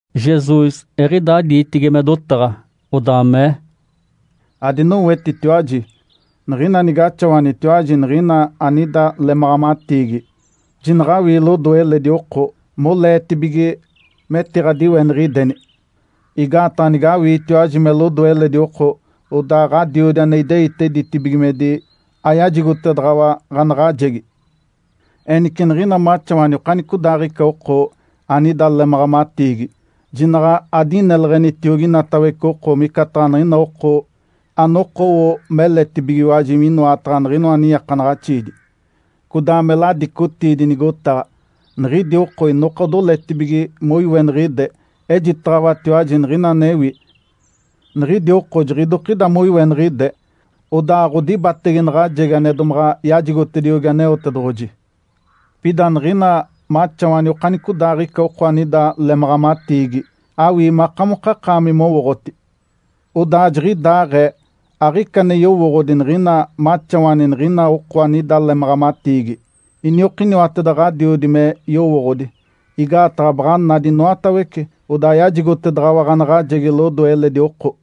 Jesus eɡ̶idaa diitigi me dotaɡ̶a, odaa mee, “Adinowetitiwaji! Niɡ̶ina nigaxawanitiwaji niɡ̶ina anida lemaɡ̶amatiigi, jinaɡ̶awii lodoe eledi oko, moleetibige metiɡ̶adiweniɡ̶ideni. Igaataɡ̶a nigawiitiwaji me lodoe eledi oko, odaa Ǥadiodi ane ideite ditibigimedi ayajigotedaɡ̶awa ɡ̶anaɡ̶ajegi. Enice niɡ̶ina maxawani okanicodaaɡ̶ica oko anida lemaɡ̶amatiigi, jinaɡ̶a adineleɡ̶enitiogi inatawece oko micataɡ̶a niɡ̶ina oko anokowo meletibigiwaji minoataɡ̶a niɡ̶inoa niiakanaɡ̶axiidi, codaa me ladicotiidi nigotaɡ̶a. Niɡ̶idi oko inoka odoletibige moiweniɡ̶ide. Ejitaɡ̶awatiwaji niɡ̶ina anewi, niɡ̶idi oko jiɡ̶idokida moiweniɡ̶ide, odaa aɡ̶odibatege naɡ̶ajegi ane domaɡ̶a yajigotediogi Aneotedoɡ̶oji. Pida niɡ̶ina maxawani okanicodaaɡ̶ica oko anida lemaɡ̶amatiigi, awii makamokakaami mowooɡ̶oti! Odaa jiɡ̶idaaɡ̶ee aɡ̶ica ane yowooɡ̶odi niɡ̶ina maxawani niɡ̶ina oko anida lemaɡ̶amatiigi. Iniokiniwateda Ǥadiodi me yowooɡ̶odi! Igaataɡ̶a baɡ̶a nadi inoatawece. Odaa yajigotedaɡ̶awa ɡ̶anaɡ̶ajegi lodoe eledi oko.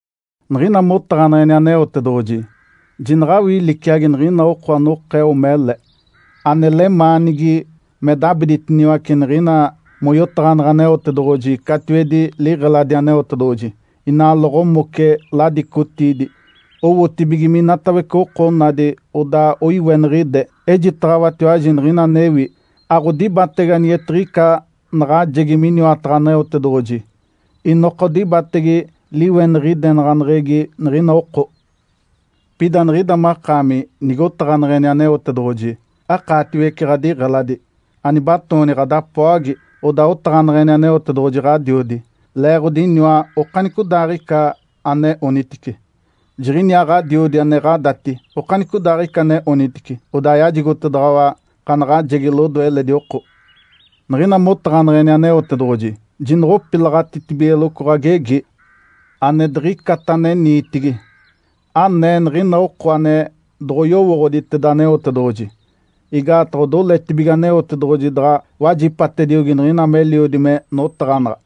Niɡ̶ina motaɡ̶aneɡ̶eni Aneotedoɡ̶oji, jinaɡ̶awii liciagi niɡ̶ina oko anokeo mele, ane lemaanigi me dabiditiniwace niɡ̶ina moyotaɡ̶aneɡ̶e Aneotedoɡ̶oji catiwedi liɡ̶eladi Aneotedoɡ̶oji, inaa loɡ̶omoce ladicotiidi, owotibige minatawece oko onadi odaa oiweniɡ̶ide. Ejitaɡ̶awatiwaji niɡ̶ina anewi, aɡ̶odibatege anigetiɡ̶ica naɡ̶ajegi miniwataɡ̶a Aneotedoɡ̶oji, inoka odibatege liweniɡ̶idenaɡ̶aneɡ̶egi niɡ̶ina oko. Pida niɡ̶ida makaami, nigotaɡ̶aneɡ̶eni Aneotedoɡ̶oji, akaatiwece ɡ̶adiɡ̶eladi, anibatooni ɡ̶adapoagi, odaa otaɡ̶aneɡ̶eni Aneotedoɡ̶oji Ǥadiodi, leeɡ̶odi iniwa okanicodaaɡ̶ica ane onitice. Jiɡ̶iniaa Ǥadiodi ane ɡ̶adati okanicodaaɡ̶ica ane onitice odaa yajigotedaɡ̶awa ɡ̶anaɡ̶ajegi lodoe eledi oko. Niɡ̶ina motaɡ̶aneɡ̶eni Aneotedoɡ̶oji, jinoɡ̶opilaɡ̶atitibigeloco ɡ̶agegi ane diɡ̶icata ane niitigi, anee niɡ̶ina oko ane doɡ̶oyowooɡ̶oditeda Aneotedoɡ̶oji. Igaataɡ̶a odiletibige Aneotedoɡ̶oji daɡ̶a wajipatediogi niɡ̶ina meliodi me notaɡ̶anaɡ̶a.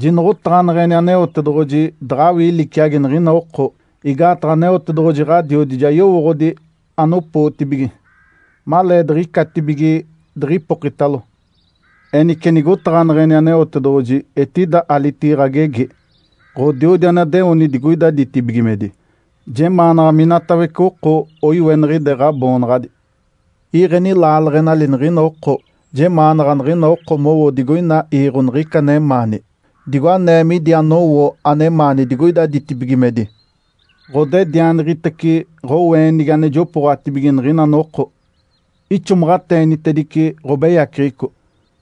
Jinoɡ̶otaɡ̶aneɡ̶eni Aneotedoɡ̶oji daɡ̶awii liciagi niɡ̶ina oko, igaataɡ̶a Aneotedoɡ̶oji Ǥadiodi ja yowooɡ̶odi anopootibige, maleediɡ̶icatibige diɡ̶ipokitalo. Enice nigotaɡ̶aneɡ̶eni Aneotedoɡ̶oji etida alitigi ɡ̶agegi, ‘Ǥodiodi anadeoni digoida ditibigimedi, jemaanaɡ̶a minatawece oko oiweniɡ̶ide Ǥaboonaɡ̶adi. Iiɡ̶eni laaleɡ̶enali niɡ̶ina oko. Jemaanaɡ̶a niɡ̶ina oko mowo digoina iiɡ̶o niɡ̶ica anemaani, digo anee midi anowo anemaani digoida ditibigimedi. Ǥodedianiɡ̶itece ɡ̶oweenigi ane jopooɡ̶atibige niɡ̶ina noko. Ixomaɡ̶ateenitedice ɡ̶obeyaceɡ̶eco,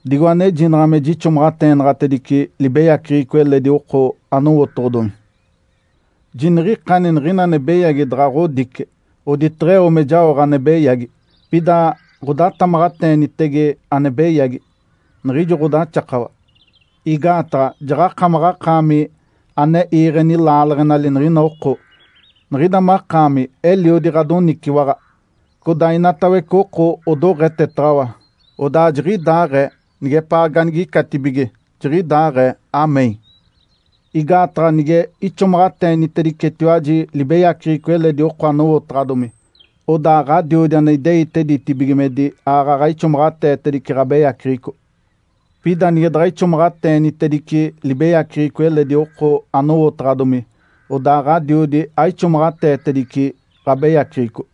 digo anejinaɡ̶a me jixomaɡ̶ateenaɡ̶atedice libeyaceɡ̶eco eledi oko anowotoɡ̶odomi. Jiniɡ̶ikani niɡ̶ina ane beyagi daɡ̶a ɡ̶odice oditeɡ̶eo me jaoɡ̶a ane beyagi. Pida ɡ̶odatamaɡ̶ateenitege ane beyagi, niɡ̶ijo ɡ̶odaxakawa. Igaataɡ̶a jaɡ̶akamaɡ̶akaami ane iiɡ̶eni laaleɡ̶enali niɡ̶ina oko. Niɡ̶ida makaami eliodi ɡ̶adoniciwaɡ̶a, codaa inatawece oko odoɡ̶etetaɡ̶awa. Odaa jiɡ̶idaaɡ̶ee nigepaa ganigicatibige. Jiɡ̶idaaɡ̶ee (Amém).’ Igaataɡ̶a nige ixomaɡ̶ateenitedicetiwaji libeyaceɡ̶eco eledi oko anowotaɡ̶adomi, odaa Ǥadiodi ane ideite ditibigimedi aaɡ̶aɡ̶a ixomaɡ̶ateetedice ɡ̶abeyaceɡ̶eco. Pida nige daɡ̶a ixomaɡ̶ateenitedice libeyaceɡ̶eco eledi oko anowotaɡ̶adomi, odaa Ǥadiodi aixomaɡ̶ateetedice ɡ̶abeyaceɡ̶eco.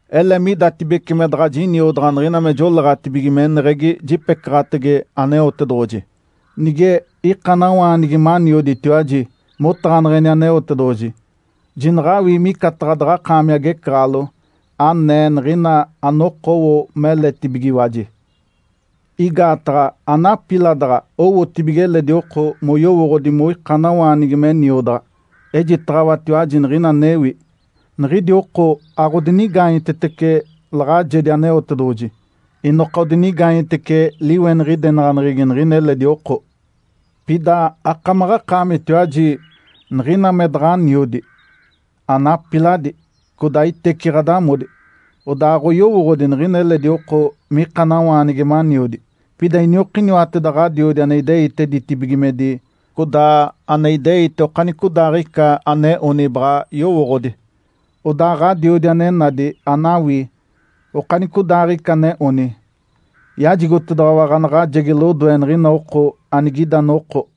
Ele midatibece me daɡ̶a jiniodaɡ̶a niɡ̶ina me joleeɡ̶atibige meneɡ̶egi jipecaɡ̶atege Aneotedoɡ̶oji. Nige ikanawaanigi manioditiwaji motaɡ̶aneɡ̶eni Aneotedoɡ̶oji, jinaɡ̶awii micataɡ̶a daɡ̶akaami agecaɡ̶alo, anee niɡ̶ina anokowo meletibigiwaji. Igaataɡ̶a anapiladaɡ̶a owotibige eledi oko moyowooɡ̶odi moikanawaanigi me niodaɡ̶a. Ejitaɡ̶awatiwaji niɡ̶ina anewi. Niɡ̶idi oko aɡ̶odinigaanyetetece laɡ̶ajedi Aneotedoɡ̶oji, inoka odinigaanyetece liweniɡ̶idenaɡ̶aneɡ̶egi niɡ̶ina eledi oko. Pida akamaɡ̶akaamitiwaji, niɡ̶ina me daɡ̶aniodi, anapiladi, codaa iteci ɡ̶adamodi, odaa aɡ̶oyowooɡ̶odi niɡ̶ina eledi oko mikanawaanigi maniodi. Pida iniokiniwateda Ǥadiodi ane ideite ditibigimedi codaa ane ideite okanicodaaɡ̶ica ane oni baɡ̶a yowooɡ̶odi. Odaa Ǥadiodi ane nadi anawii okanicodaaɡ̶ica ane oni, yajigotedaɡ̶awa ɡ̶anaɡ̶ajegi lodoe niɡ̶ina oko anigida noko.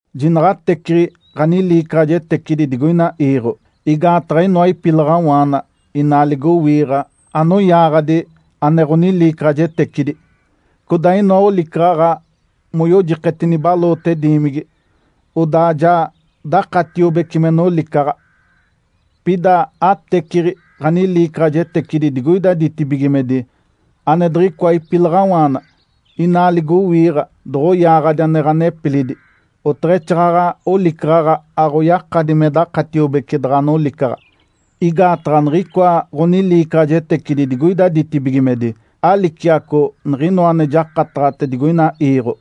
Jinaɡ̶a ateciɡ̶i ɡ̶aniliicaɡ̶ajetecidi digoina iiɡ̶o, igaataɡ̶a inoa ipilaɡ̶awaana inaa ligowiiɡ̶a anoyaaɡ̶adi ane ɡ̶oniliicaɡ̶ajetecidi, codaa inoa olicaɡ̶aɡ̶a moyojiketi nibaloote diimigi, odaa ja dakatiobece me nolicaɡ̶a. Pida ateciɡ̶i ɡ̶aniliicaɡ̶ajetecidi digoida ditibigimedi ane diɡ̶icoa ipilaɡ̶awaana inaa ligowiiɡ̶a doɡ̶oyaaɡ̶adi ane ɡ̶anepilidi, oteɡ̶exaaɡ̶aɡ̶a olicaɡ̶aɡ̶a aɡ̶oyakadi me dakatiobece daɡ̶a nolicaɡ̶a. Igaataɡ̶a niɡ̶icoa ɡ̶oniliicaɡ̶ajetecidi digoida ditibigimedi aliciaco niɡ̶inoa ane jakataɡ̶ate digoina iiɡ̶o.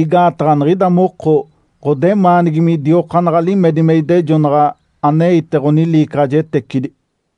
Igaataɡ̶a niɡ̶ida moko ɡ̶odemaanigi midiokaanaɡ̶a limedi me idejonaɡ̶a aneite ɡ̶oniliicaɡ̶ajetecidi.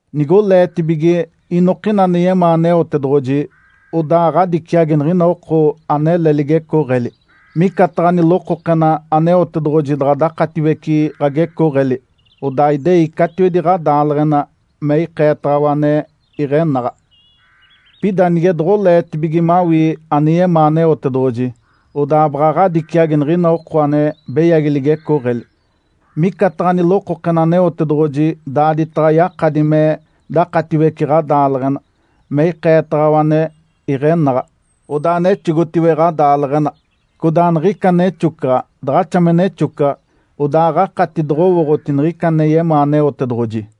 Nigoleetibige inokina ane yemaa Aneotedoɡ̶oji, odaa ɡ̶adiciagi niɡ̶ina oko anele ligecooɡ̶eli. Micataɡ̶a nilokokena Aneotedoɡ̶oji daɡ̶a dakatiwece ɡ̶agecooɡ̶eli, odaa idei catiwedi ɡ̶adaaleɡ̶ena me ikeetaɡ̶awa ane iɡ̶enaɡ̶a. Pida nige doɡ̶oleetibige mawii ane yemaa Aneotedoɡ̶oji, odaa baɡ̶a ɡ̶adiciagi niɡ̶ina oko ane beyagi ligecooɡ̶eli. Micataɡ̶a nilokokena Aneotedoɡ̶oji daaditaɡ̶a yakadi me dakatiwece ɡ̶adaaleɡ̶ena me ikeetaɡ̶awa ane iɡ̶enaɡ̶a. Odaa nexogotiwe ɡ̶adaaleɡ̶ena. Codaa niɡ̶ica nexocaɡ̶a daɡ̶axa me nexocaɡ̶a, odaa aɡ̶akati doɡ̶owooɡ̶oti niɡ̶ica ane yemaa Aneotedoɡ̶oji.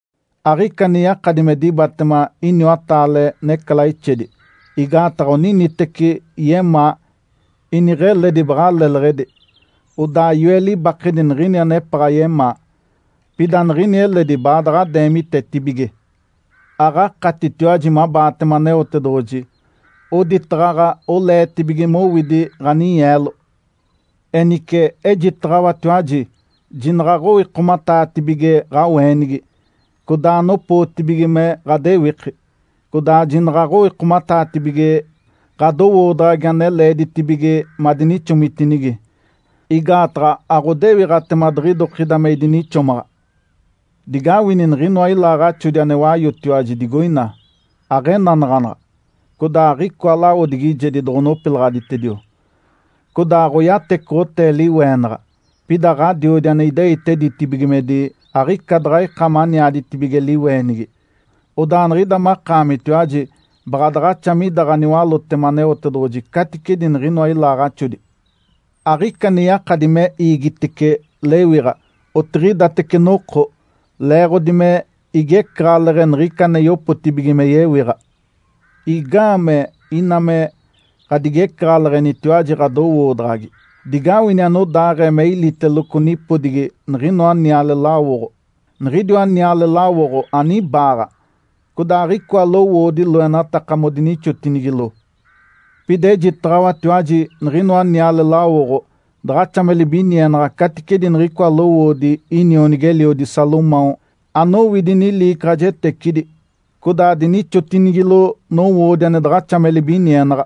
Aɡ̶ica ane yakadi me dibatema iniwataale necalaixedi, igaataɡ̶a oniniteci yemaa, iniɡ̶eledi baɡ̶a leleɡ̶edi, odaa yoe libakedi niɡ̶ini anepaɡ̶a yemaa. Pida niɡ̶ini eledi baadaɡ̶a deemitetibige. Aɡ̶akatitiwaji mabaatema Aneotedoɡ̶oji, oditaɡ̶aɡ̶a oleetibige mowidi ɡ̶aninyeelo. Enice ejitaɡ̶awatiwaji jinaɡ̶aɡ̶owikomataatibige ɡ̶aweenigi, codaa anopootibige me ɡ̶adewiki, codaa jinaɡ̶a aɡ̶owikomataatibige ɡ̶adowoodaɡ̶agi ane leeditibige madinixomitinigi, igaataɡ̶a aɡ̶odewiɡ̶atema diɡ̶idokida me idinixomaɡ̶a. Digawini niɡ̶inoa ilaaɡ̶axodi ane wayotiwaji digoina! Aɡ̶enanaɡ̶anaɡ̶a, codaa aɡ̶icoa lawodigijedi doɡ̶onopilaɡ̶aditedio, codaa aɡ̶oyatecoɡ̶otee liweenaɡ̶a. Pida Ǥadiodi ane ideite ditibigimedi aɡ̶ica daɡ̶a ika maniaditibige liweenigi. Odaa niɡ̶ida makaamitiwaji baɡ̶a daɡ̶axa mida ɡ̶aniwalótema Aneotedoɡ̶oji caticedi niɡ̶inoa ilaaɡ̶axodi. Aɡ̶ica ane yakadi me iigitice lewiɡ̶a otiɡ̶idatece noko leeɡ̶odi me igecaɡ̶aleɡ̶e niɡ̶ica ane yopotibige me yewiɡ̶a. Igaamee ina me ɡ̶adigecaɡ̶aleɡ̶enitiwaji ɡ̶adowoodaɡ̶agi? Digawini anodaaɡ̶ee me iliteloco nipodigi niɡ̶inoa niale lawoɡ̶o. Niɡ̶idiwa niale lawoɡ̶o anibaaɡ̶a, codaa aɡ̶icoa lowoodi loenataka modinixotinigilo. Pida ejitaɡ̶awatiwaji niɡ̶inoa niale lawoɡ̶o daɡ̶axa me libinienaɡ̶a caticedi niɡ̶icoa lowoodi inionigi-eliodi Salomão anowidi niliicaɡ̶ajetecidi codaa dinixotinigilo nowoodi ane daɡ̶axa me libinienaɡ̶a.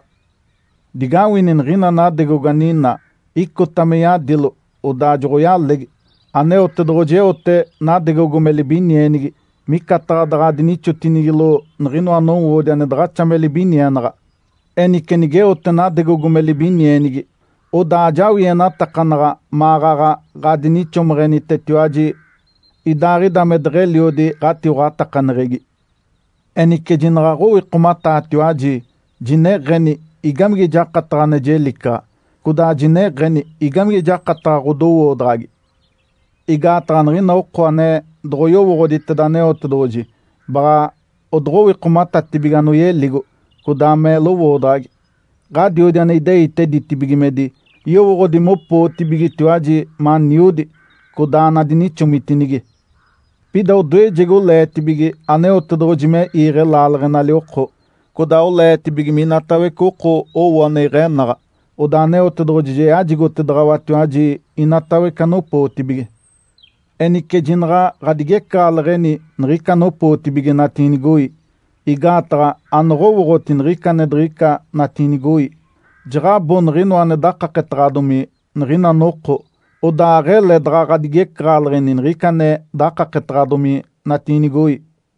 Digawini niɡ̶ina nadegogo aninaa, icota me yadilo, odaa joɡ̶oyalegi. Aneotedoɡ̶oji eote nadegogo me libinienigi micataɡ̶a daɡ̶a dinixotinigilo niɡ̶inoa nowoodi ane daɡ̶axa me libinienaɡ̶a. Enice nigeote nadegogo me libinienigi, odaa ajawienatakanaɡ̶a maɡ̶aɡ̶a ɡ̶adinixomeɡ̶enitetiwaji idaaɡ̶ida me deɡ̶eliodi ɡ̶atiwaɡ̶atakaneɡ̶egi. Enice jinaɡ̶aɡ̶owikomataatiwaji, jineɡ̶eni, ‘Igamige jakataɡ̶a ane jelicaɡ̶a?’ codaa jineɡ̶eni, ‘Igamige jakataɡ̶a ɡ̶odowoodaɡ̶agi?’ Igaataɡ̶a niɡ̶ina oko ane doɡ̶oyowooɡ̶oditeda Aneotedoɡ̶oji baɡ̶a odoɡ̶owikomatatibige anoyeligo, codaa me lowoodaɡ̶agi. Ǥadiodi ane ideite ditibigimedi yowooɡ̶odi mopootibigetiwaji maniodi, codaa anadinixomitinigi. Pida odoejegi oleetibige Aneotedoɡ̶oji me iiɡ̶e laaleɡ̶enali oko, codaa oleetibige minatawece oko owo ane iɡ̶enaɡ̶a, odaa Aneotedoɡ̶oji ja yajigotedaɡ̶awatiwaji inatawece anopootibige. Enice jinaɡ̶a ɡ̶adigecaɡ̶aleɡ̶eni niɡ̶ica anopootibige natiinigoi. Igaataɡ̶a anoɡ̶owooɡ̶oti niɡ̶ica ane diɡ̶ica natiinigoi. Jaɡ̶abo niɡ̶inoa ane dakaketaɡ̶adomi niɡ̶ina noko, odaa aɡ̶ele daɡ̶a ɡ̶adigecaɡ̶aleɡ̶eni niɡ̶ica ane dakaketaɡ̶adomi natiinigoi.”